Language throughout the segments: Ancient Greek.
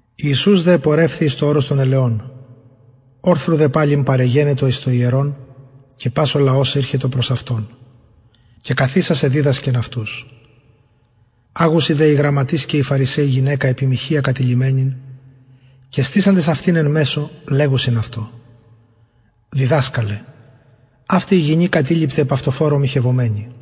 ιησους δε επορευθη εις το ορος των ελαιων ορθρου δε παλιν παρεγενετο εις το ιερον και πας ο λαος ηρχετο και καθισας εδιδασκεν αυτους αγουσιν δε οι γραμματεις και οι φαρισαιοι προς αυτον γυναικα εν μοιχεια καταληφθεισαν και στησαντες αυτην εν μεσω λεγουσιν αυτω πειραζοντες διδασκαλε αυτη η γυνη κατεληφθη επ αυτοφορω μοιχευομενη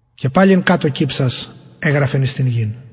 και παλιν κατω κυψας εγραφεν εις την γην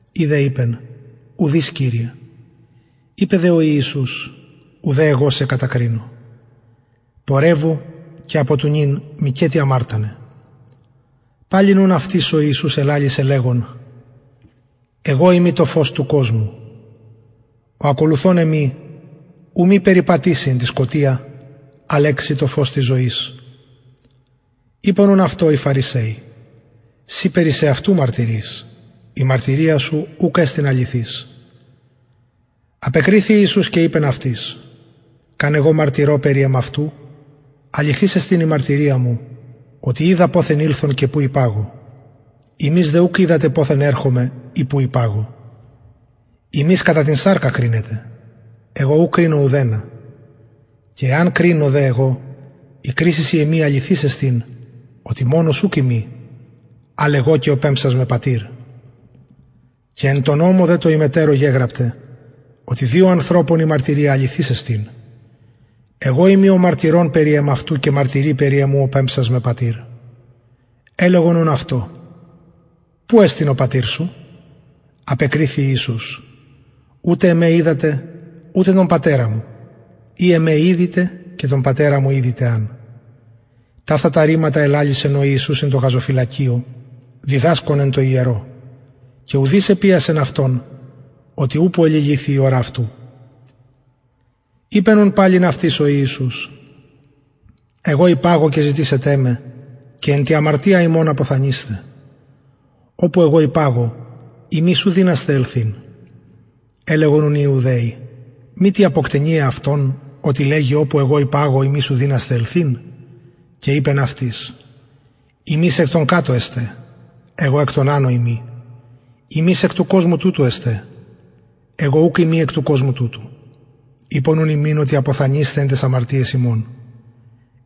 η δε ειπεν ουδεις κυριε ειπεν δε ο ιησους ουδε εγω σε κρινω πορευου και μηκετι αμαρτανε παλιν ουν αυτοις ο ιησους ελαλησεν λεγων εγω ειμι το φως του κοσμου ο ακολουθων εμοι ου μη περιπατηση εν τη σκοτια αλλ εξει το φως της ζωης ειπον ουν αυτω οι φαρισαιοι συ περι σεαυτου μαρτυρεις η μαρτυρια σου ουκ εστιν αληθης απεκριθη ιησους και ειπεν αυτοις καν εγω μαρτυρω περι εμαυτου αληθης εστιν η μαρτυρια μου οτι οιδα ποθεν ηλθον και που υπαγω υμεις δε ουκ οιδατε ποθεν ερχομαι και που υπαγω υμεις κατα την σαρκα κρινετε εγω ου κρινω ουδενα και εαν κρινω δε εγω η κρισις η εμη αληθης εστιν οτι μονος ουκ ειμι αλλ εγω και ο πεμψας με πατηρ και εν τω νομω δε τω υμετερω γεγραπται οτι δυο ανθρωπων η μαρτυρια αληθης εστιν εγω ειμι ο μαρτυρων περι εμαυτου και μαρτυρει περι εμου ο πεμψας με πατηρ ελεγον ουν αυτω που εστιν ο πατηρ σου απεκριθη ιησους ουτε εμε οιδατε ουτε τον πατερα μου ει εμε ηδειτε και τον πατερα μου ηδειτε αν ταυτα τα ρηματα ελαλησεν ο ιησους εν τω γαζοφυλακιω διδασκων εν τω ιερω και ουδεις επιασεν αυτον οτι ουπω εληλυθει η ωρα αυτου ειπεν ουν παλιν αυτοις ο ιησους εγω υπαγω και ζητησετε με και εν τη αμαρτια υμων αποθανεισθε οπου εγω υπαγω υμεις ου δυνασθε ελθειν ελεγον ουν οι ιουδαιοι μητι αποκτενει εαυτον οτι λεγει οπου εγω υπαγω υμεις ου δυνασθε ελθειν και ειπεν αυτοις υμεις εκ των κατω εστε εγω εκ των ανω ειμι υμεις εκ του κοσμου τουτου εστε εγω ουκ ειμι εκ του κοσμου τουτου ειπον ουν υμιν οτι αποθανεισθε εν ταις αμαρτιαις υμων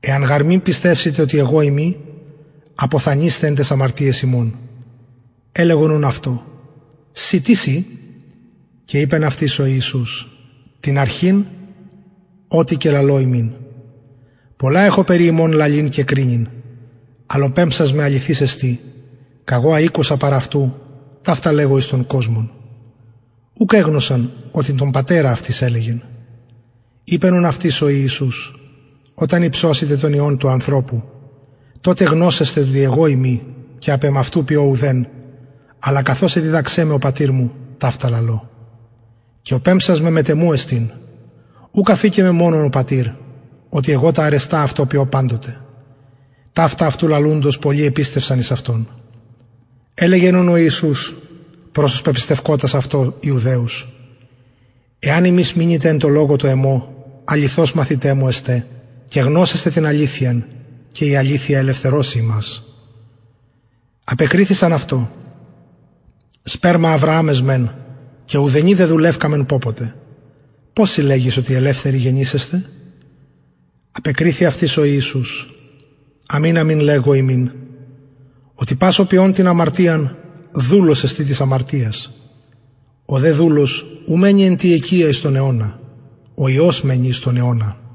εαν γαρ μη πιστευσητε οτι εγω ειμι αποθανεισθε εν ταις αμαρτιαις υμων ελεγον ουν αυτω συ τις ει και ειπεν αυτοις ο ιησους την αρχην ο τι και λαλω υμιν πολλα εχω περι υμων λαλειν και κρινειν αλλ ο πεμψας με αληθης εστιν καγω α ηκουσα παρ αυτου ταυτα λεγω εις τον κοσμον ουκ εγνωσαν οτι τον πατερα αυτοις ελεγεν ειπεν ουν αυτοις ο ιησους οταν υψωσητε τον υιον του ανθρωπου τοτε γνωσεσθε οτι εγω ειμι και απ εμαυτου ποιω ουδεν αλλα καθως εδιδαξεν με ο πατηρ μου ταυτα λαλω και ο πεμψας με μετ εμου εστιν ουκ αφηκεν με μονον ο πατηρ οτι εγω τα αρεστα αυτω ποιω παντοτε ταυτα αυτου λαλουντος πολλοι επιστευσαν εις αυτον ελεγεν ουν ο ιησους προς τους πεπιστευκοτας αυτω ιουδαιους εαν υμεις μεινητε εν τω λογω τω εμω αληθως μαθηται μου εστε και γνωσεσθε την αληθειαν και η αληθεια ελευθερωσει υμας απεκριθησαν αυτω σπερμα αβρααμ εσμεν και ουδενι δεδουλευκαμεν πωποτε πως συ λεγεις οτι ελευθεροι γενησεσθε απεκριθη αυτοις ο ιησους αμην αμην λεγω υμιν οτι πας ο ποιων την αμαρτιαν δουλος εστιν της αμαρτιας ο δε δουλος ου μενει εν τη οικια εις τον αιωνα ο υιος μενει εις τον αιωνα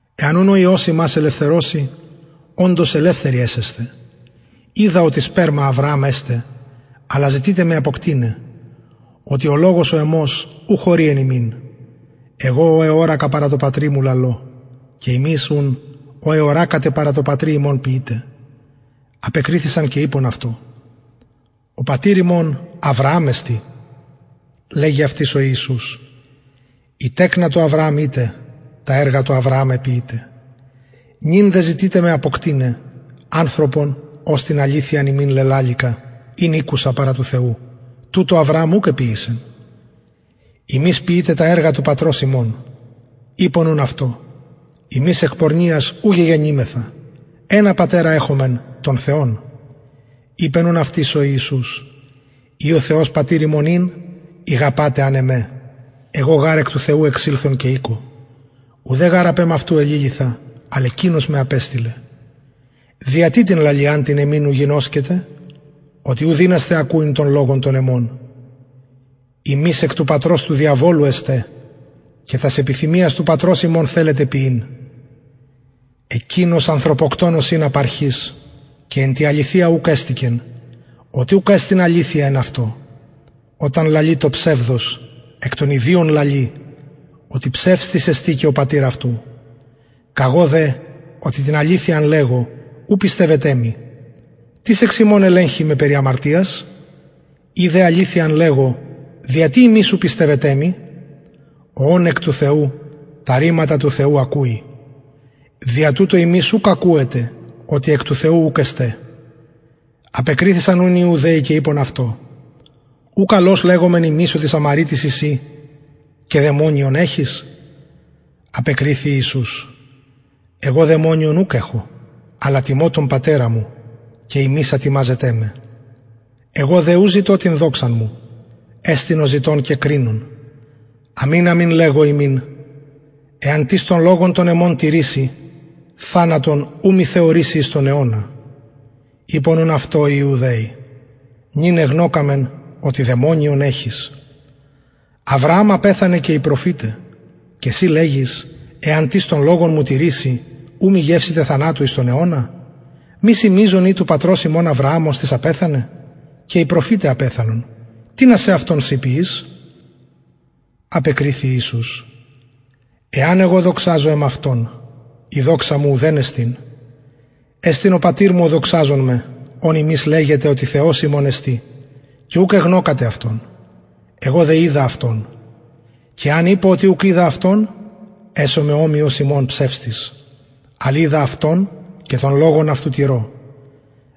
εαν ουν ο υιος υμας ελευθερωση οντως ελευθεροι εσεσθε οιδα οτι σπερμα αβρααμ εστε αλλα ζητειτε με αποκτειναι οτι ο λογος ο εμος ου χωρει εν υμιν εγω ο εωρακα παρα τω πατρι μου λαλω και υμεις ουν ο εωρακατε παρα τω πατρι υμων ποιειτε απεκριθησαν και ειπον αυτω ο πατηρ ημων αβρααμ εστιν λεγει αυτοις ο ιησους ει τεκνα του αβρααμ ητε τα εργα του αβρααμ εποιειτε νυν δε ζητειτε με αποκτειναι ανθρωπον ος την αληθειαν υμιν λελαληκα ην ηκουσα παρα του θεου τουτο αβρααμ ουκ εποιησεν υμεις ποιειτε τα εργα του πατρος υμων ειπον ουν αυτω ημεις εκ πορνειας ου γεγεννημεθα ενα πατερα εχομεν τον θεον ειπεν ουν αυτοις ο ιησους ει ο θεος πατηρ υμων ην ηγαπατε αν εμε εγω γαρ εκ του θεου εξηλθον και ηκω ουδε γαρ απ εμαυτου εληλυθα αλλ εκεινος με απεστειλεν δια τι την λαλιαν την εμην ου γινωσκετε οτι ου δυνασθε ακουειν τον λογον τον εμον υμεις εκ του πατρος του διαβολου εστε και τας επιθυμιας του πατρος υμων θελετε ποιειν εκεινος ανθρωποκτονος ην απ αρχης και εν τη αληθεια ουχ εστηκεν οτι ουκ εστιν αληθεια εν αυτω οταν λαλη το ψευδος εκ των ιδιων λαλει οτι ψευστης εστιν και ο πατηρ αυτου εγω δε οτι την αληθειαν λεγω ου πιστευετε μοι τις εξ υμων ελεγχει με περι αμαρτιας ει δε αληθειαν λεγω δια τι υμεις ου πιστευετε μοι ο ων εκ του θεου τα ρηματα του θεου ακουει δια τουτο υμεις ουκ ακουετε οτι εκ του θεου ουκ εστε απεκριθησαν ουν οι ιουδαιοι και ειπον αυτω ου καλως λεγομεν ημεις οτι σαμαρειτης ει συ και δαιμονιον εχεις απεκριθη ιησους εγω δαιμονιον ουκ εχω αλλα τιμω τον πατερα μου και υμεις ατιμαζετε με εγω δε ου ζητω την δοξαν μου εστιν ο ζητων και κρινων αμην αμην λεγω υμιν εαν τις τον λογον τον εμον τηρηση θανατον ου μη θεωρηση εις τον αιωνα ειπον ουν αυτω οι ιουδαιοι νυν εγνωκαμεν οτι δαιμονιον εχεις αβρααμ απεθανεν και οι προφηται και συ λεγεις εαν τις τον λογον μου τηρηση ου μη γευσηται θανατου εις τον αιωνα μη συ μειζων ει του πατρος ημων αβρααμ οστις απεθανεν και οι προφηται απεθανον τινα σεαυτον συ ποιεις απεκριθη ιησους εαν εγω δοξαζω εμαυτον η δοξα μου ουδεν εστιν εστιν ο πατηρ μου ο δοξαζων με ον υμεις λεγετε οτι θεος ημων εστιν και ουκ εγνωκατε αυτον εγω δε οιδα αυτον και εαν ειπω οτι ουκ οιδα αυτον εσομαι ομοιος υμων ψευστης αλλ οιδα αυτον και τον λογον αυτου τηρω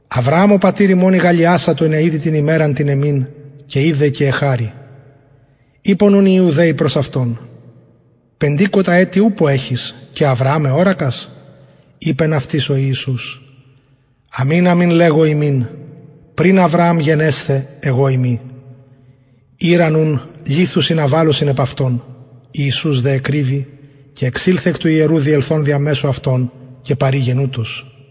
αβρααμ ο πατηρ υμων ηγαλλιασατο ινα ιδη την ημεραν την εμην και ειδεν και εχαρη ειπον ουν οι ιουδαιοι προς αυτον πεντηκοντα ετη ουπω εχεις και αβρααμ εωρακας ειπεν αυτοις ο ιησους αμην αμην λεγω υμιν πριν αβρααμ γενεσθαι εγω ειμι ηραν ουν λιθους ινα βαλωσιν επ αυτον ιησους δε εκρυβη και εξηλθεν εκ του ιερου διελθων δια μεσου αυτων και παρηγεν ουτως